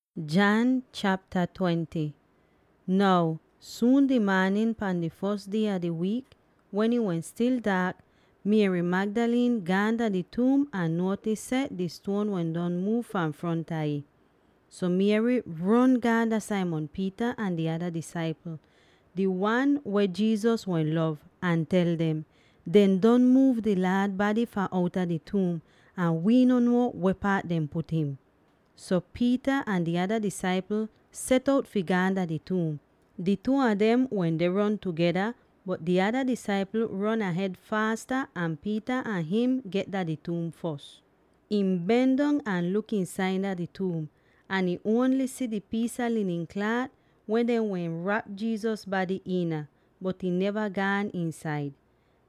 Jesus deh liv agen! Now, suun di maanin pan di fos die a di wiik, wen ih wehn stil daak, Mary Magdalene gaan dah di tuum ahn nuotis seh di stuon wehn don muuv fahn fronta ih. So Mary ron gaan dah Simon Peter ahn di ada disaipl —di wan weh Jesus wehn lov— ahn tel dem, “Dehn don muuv di Laad bady fahn outa di tuum, ahn wii no nuo weh paat dehn put him!” So Peter ahn di ada disaipl set out fi gaan dah di tuum; di two a dem wende ron tugeda, bot di ada disaipl ron ahed faasa an Peter ahn him get dah di tuum fos. Ihn ben dong ahn luk iinsaida di tuum, ahn ihn ongl si di piis a linin klaat weh dehn wehn rap Jesus bady iina, bot ihn neva gaan iinsaid.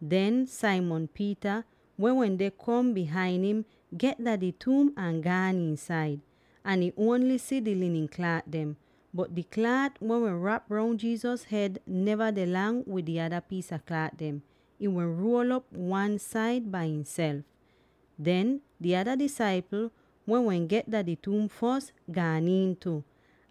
Den Simon Peter, weh wende kom bihain him, get dah di tuum ahn gaan iinsaid; ahn ihn ongl si di linin klaat dem. Bot di klaat weh wehn rap roun Jesus hed neva deh, lang wid di ada piis a klaat dem; ih wehn ruol'op wan-said bai ihself. Den di ada disaipl, weh wehn get dah di tuum fos, gaan iin tu;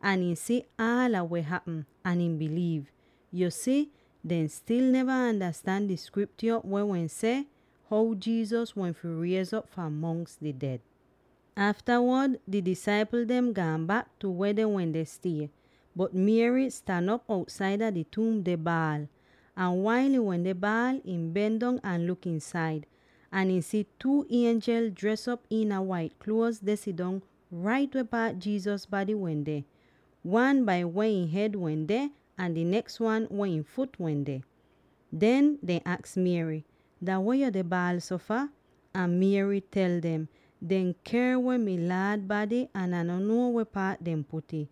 ahn ihn si aala weh hapm, ahn ihn biliiv. Yu si, dehn stil neva andastan di Skriptyo weh wehn seh how Jesus wehn fi riez'op fahn mongs di ded. Aftawod di disaipl dem gaan bak tu weh dehn wende stie. Bot Mary stan op outsaida di tuum deh baal. Ahn wail ihn wende baal, ihn ben dong ahn luk iinsaid. Ahn ihn si two ienjel dres op iina wait kluoz deh sidong rait weh paat Jesus bady wende; wan bai weh ihn hed wende, ahn di neks wan weh ihn fut wende. Den dehn aks Mary, “Dah weh yo deh baal so fah?” Ahn Mary tel dem, “Dehn ker weh mi Laad bady ahn Ah no nuo weh paat dehn put'ih.”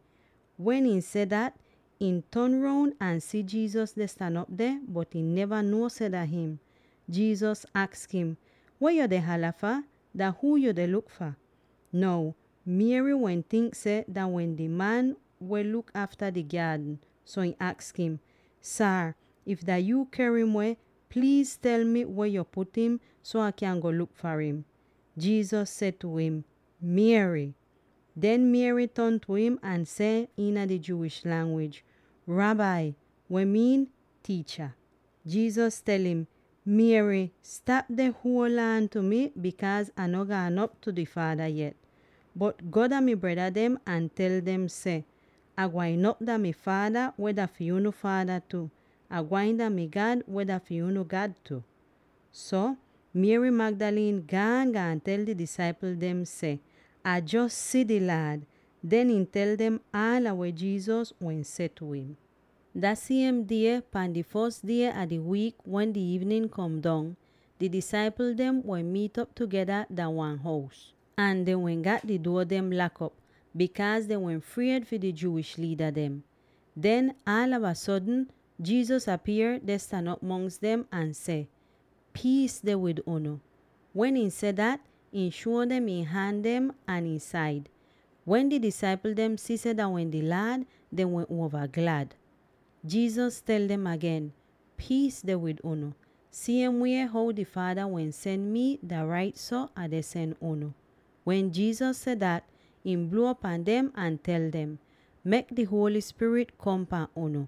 Wen ihn seh dat, ihn ton roun ahn si Jesus deh stan op deh, bot ihn neva nuo seh dah him. Jesus aks im, “Weh yo deh hala fah? Dah huu yu deh luk fah?” Now Mary wehn tink seh dah wehn di man weh luk afta di gyaadn, so ihn aks im, “Saar, if dah yuu ker im weh, pliiz tel mi weh yo put im, so Ah kyan go luk far im.” Jesus seh tu im, “Mary!” Den Mary ton tu im ahn seh iina di Jewish langwij, “Rabbi!” (weh miin “Tiicha.”) Jesus tel im, “Mary, stap deh huol aan pahn mi, bikaaz Ah no gaan op tu di Faada yet. Bot go dah mi breda dem ahn tel dem seh, ‘Ah gwain op dah mi Faada, weh dah fi unu Faada tu; Ah gwain dah mi God, weh dah fi unu God tu.’” So, Mary Magdalene gaan, gaan tel di disaipl dem seh, “Ah jos si di Laad!” Den, ihn tel dem aala weh Jesus wehn seh tu im. Dah siem die pahn di fos die a di wiik wen di iivnin kom dong, di disaipl dem wehn miit'op tugeda dah wan hous. Ahn dehn wehn gat di duo dem lak'op, bikaaz dehn wehn fried fi di Jewish liida dem. Den aalava sodn Jesus apier deh stan op mongs dem ahn seh, “Piis deh wid unu!” Wen ihn seh dat, ihn shuo dem ihn han dem ahn ihn said. Wen di disaipl dem si seh dah wehn di Laad, dehn wehn uova glad. Jesus tel dem agen, “Piis deh wid unu. Siem wie how di Faada wehn sen mi, dah rait so Ah deh sen unu.” Wen Jesus seh dat, ihn bluo pahn dem ahn tel dem, “Mek di Holy Spirit kom pahn unu.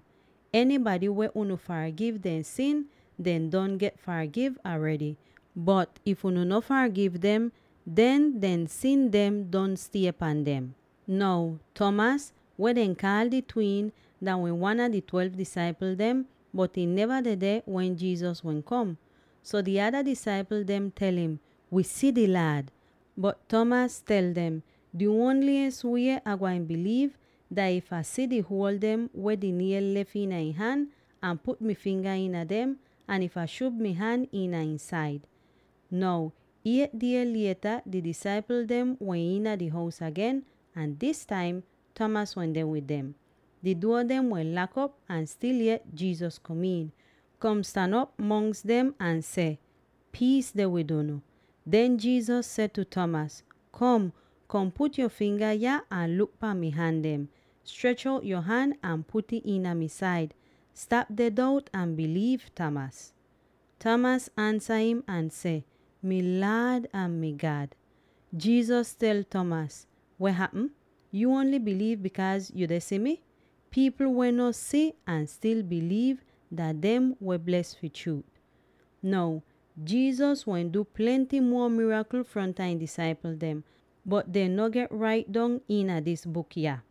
Enybady weh unu fargiv dehn sin, dehn don get fargiv aredy, bot if unu no fargiv dem, den dehn sin don stie pan dem.” Now Thomas, weh dehn kaal di Twin, dah wehn wan a di twelve disaipl dem, bot ihn neva dedeh wen Jesus wehn kom. So di ada disaipl dem tel im, “Wi si di Laad!” Bot Thomas tel dem, “Di ongl wie Ah gwain biliiv, dah if Ah si di huol dem weh di niel lef iina ihn han, ahn put mi finga iina dem, ahn if Ah shub mi han iina ihn said.” Now eight diez lieta di disaipl dem wehn iina di hous agen, ahn dis taim Thomas wende wid dem. Di duo dem wehn lak'op ahn stil yet Jesus kom iin, kom stan op mongs dem ahn seh, “Piis deh wid unu.” Den Jesus seh tu Thomas, “Kom, kom put yo finga yah ahn luk pahn mi han dem. Strech out yo han ahn put'ih iina mi said. Stap deh dout ahn biliiv, Thomas.” Thomas ansa im ahn seh, “Mi Laad ahn mi God!” Jesus tel Thomas, “Weh hapm? Yu ongl biliiv bikaaz yu deh si mi? Pipl weh no si ahn stil biliiv, dah dem weh bles fi chruut.” Now Jesus wehn du plenty muo mirakl fronta ihn disaipl dem, bot dem no get rait dong iina dis buk yah.